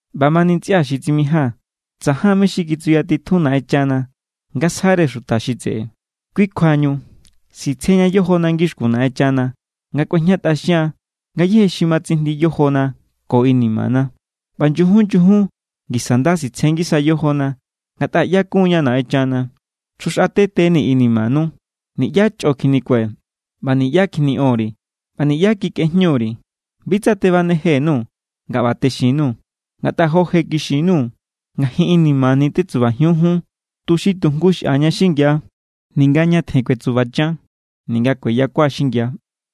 ꞌBamani ntsꞌia xi tsimijía̱n, tsajan mé= xi kitsuyatitjun Naꞌenchana nga sjare xuta xi tseꞌe. Kui kjuañu sitsjeña yojona ngixkun Naꞌenchana nga kꞌuejñatꞌaxian ngayéje xi ma tsijndi yojona ko inimana. ꞌBa nyujun nyujun ngisa nda sitsje ngisa yojona ngatꞌa ꞌyakun=ña Naꞌenchana. Chjuxꞌatetenii̱ inimanu. Niꞌyá chꞌo kjinikue̱, ꞌba niꞌyá kjiniꞌon_ri̱, ꞌba niꞌyá kikꞌejñu_ri̱. Bi tsa tebaneje_nuu̱ nga ꞌba texin_nuu̱. Ngatꞌa jo je kixin_nuu̱, ngajin inimani̱= tetsubajiun jun, tuxi tu jngu xꞌaña xingia, ninga ñatjen kuetsubachan ninga kueyakua xingia.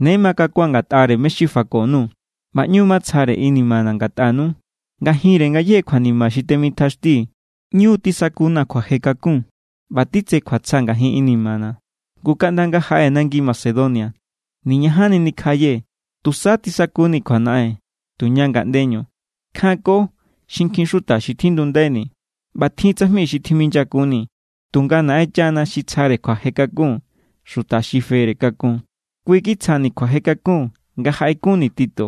Ne makakua̱n ngatꞌare mé= xi fako_nuu̱, ꞌba ꞌñu matsjare inimana̱ ngatꞌanu. Ngajinre ngayéje kjuanima xi temitjaxtii̱, ꞌñu tisakuna̱ kjuaje kakun ꞌba titse kjuatsja ngajin inimana̱. Ngu kaꞌnda nga jaꞌee̱ nangi Macedonia, niñajanni nikjaꞌayee̱. Tusa tisakuni̱ kjuanaꞌen tuña ngaꞌndeñu. Kjanko xinkjin xuta xi tjindundaini̱, ꞌba tjin tsajmi xi tjiminyakunni̱. Tunga Naꞌenchana xi tsjare kjuaje kakun xuta xi fere kakun, kui kitsjani̱ kjuaje kakun nga jaꞌekunni̱ Tito.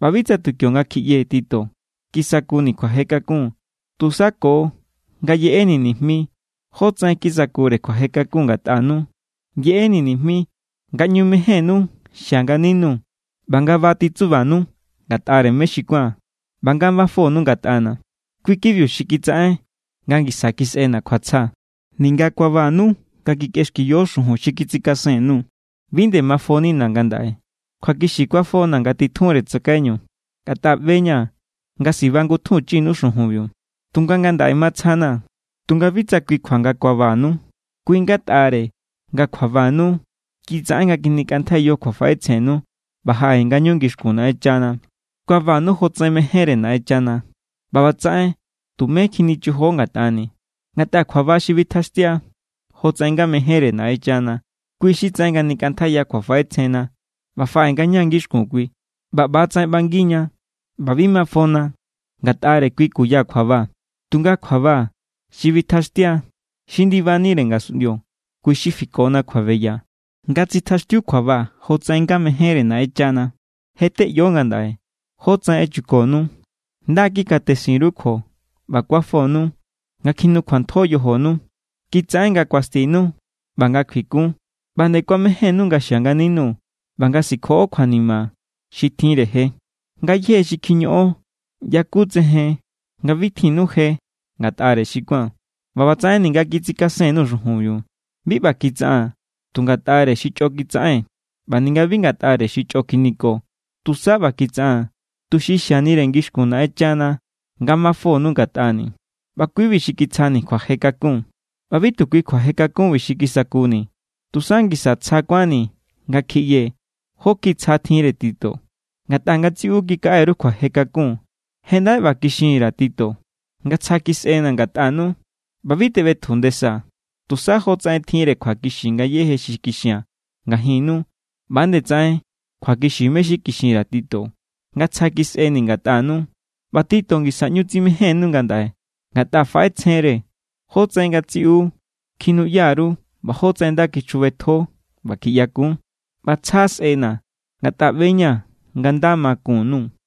ꞌBa bi tsa tu kionga kjiꞌyee̱ Tito kisakuni̱ kjuaje kakun, tusa ko nga yeꞌeni̱ nijmi jótsaꞌen kisakure kjuaje kakun ngatꞌanu. Yeꞌeni̱ nijmi nga ꞌñu mejénnú xia nganinuu̱ ꞌba nga ba titsubanu ngatꞌare mé xi kuán ꞌba nga mafonu ngatꞌana̱. Kui= kibiu xi kitsaꞌen nga ngisa kisꞌena̱ kjuatsja. Ninga kuabanu nga kikꞌexkiyo xujun xi kitsikasen_nuu̱, bi nde mafonina̱ ngandaꞌe. Kjuakixi kuafona̱ nga titjunre tsakaiñu, ngatꞌa ꞌbe=ña̱ nga sibangutjunchinu xujunbiu. Tunga ngandaꞌe matsja=na̱ tunga bi tsa kui kjua nga kuabanu, kui= ngatꞌare nga kjuabanu kitsaꞌen nga kjinikꞌantjaiyo kjuafaꞌetsjennu ꞌba jaꞌe ngañu ngixkun Naꞌenchana. Kuabanu jotsaꞌen mejénre Naꞌenchana. ꞌBa ꞌbatsaꞌen tumé kjinichojo ngatꞌani̱. Ngatꞌa kjuaba xi bitjaxtia jotsaꞌen nga mejénre Naꞌenchana, kui xi tsaꞌen nga nikꞌantjaiya kjuafaꞌetsjenna ꞌba faꞌe ngaña ngixkun kui. ꞌBa ꞌba=tsaꞌen ꞌbangiña ꞌba bi ma mafona ngatꞌare kui kuya kjuaba. Tunga kjuaba xi bitjaxtia xi ndibanire ngasunꞌndio, kui xi fikona kjuabeya. Nga tsitjaxtiu kjuaba jotsaꞌen nga mejénre Naꞌenchana, je= teꞌyo ngandaꞌe jótsaꞌen echukonu. Nda= kikatesin_ru kjuo ꞌba kuafonu nga kjinukjuantjo yojonu. Kitsaꞌen nga kuastinu ꞌba nga kjuikun. ꞌBa nde kuamejénnu nga xia nganinuu̱ ꞌba nga sikjoꞌo kjuanima xi tjinre je. Ngayéje xi kjiñoꞌon yakutsejen nga bi tjinnu je ngatꞌare xi kuán. ꞌBa ꞌbatsaꞌen ninga kitsikasen_nuu̱ xujunbiu, bi ꞌba kitsaꞌaa̱n tu ngatꞌare xi chꞌo kitsaꞌen ꞌba ninga bi ngatꞌare xi chꞌo kjiniko, tusa ꞌba kitsaꞌaa̱n tuxi xianire ngixkun Naꞌenchana nga mafonu ngatꞌani̱. ꞌBa kui=bi xi kitsjani̱ kjuaje kakun. ꞌBa bi tu kui kjuaje kakunbi xi kisakuni̱. Tusa ngisa tsja kuánni̱ nga kjiꞌyee̱ jó kjiꞌi tsja tjinre Tito. Ngatꞌa ngatsiꞌu kikaꞌe_ru kjuaje kakun. Je ndaꞌe ꞌba kixinni_ra̱ Tito nga tsja kisꞌena̱ ngatꞌanu, ꞌba bi teꞌbetju ndesaa̱. Tusa jotsaꞌen tjinre kjuakixi ngayéje xi kixia̱n ngajinnu, ꞌba=nde tsaꞌen kjuakixi mé= xi kikꞌin_ri̱ Tito nga tsja kisꞌeni̱ ngatꞌanu. ꞌBa Tito ngisa ꞌñu tsimejénnu ngandaꞌe, ngatꞌa faꞌetsjen=re jótsaꞌen ngatsiꞌu kjinuꞌya_ru ꞌba jótsaꞌen nda kichjubetjo ꞌba kjiꞌyakun. ꞌBa tsja sꞌena̱, ngatꞌa ꞌbe=ña̱ nga nda ma kun_nuu̱.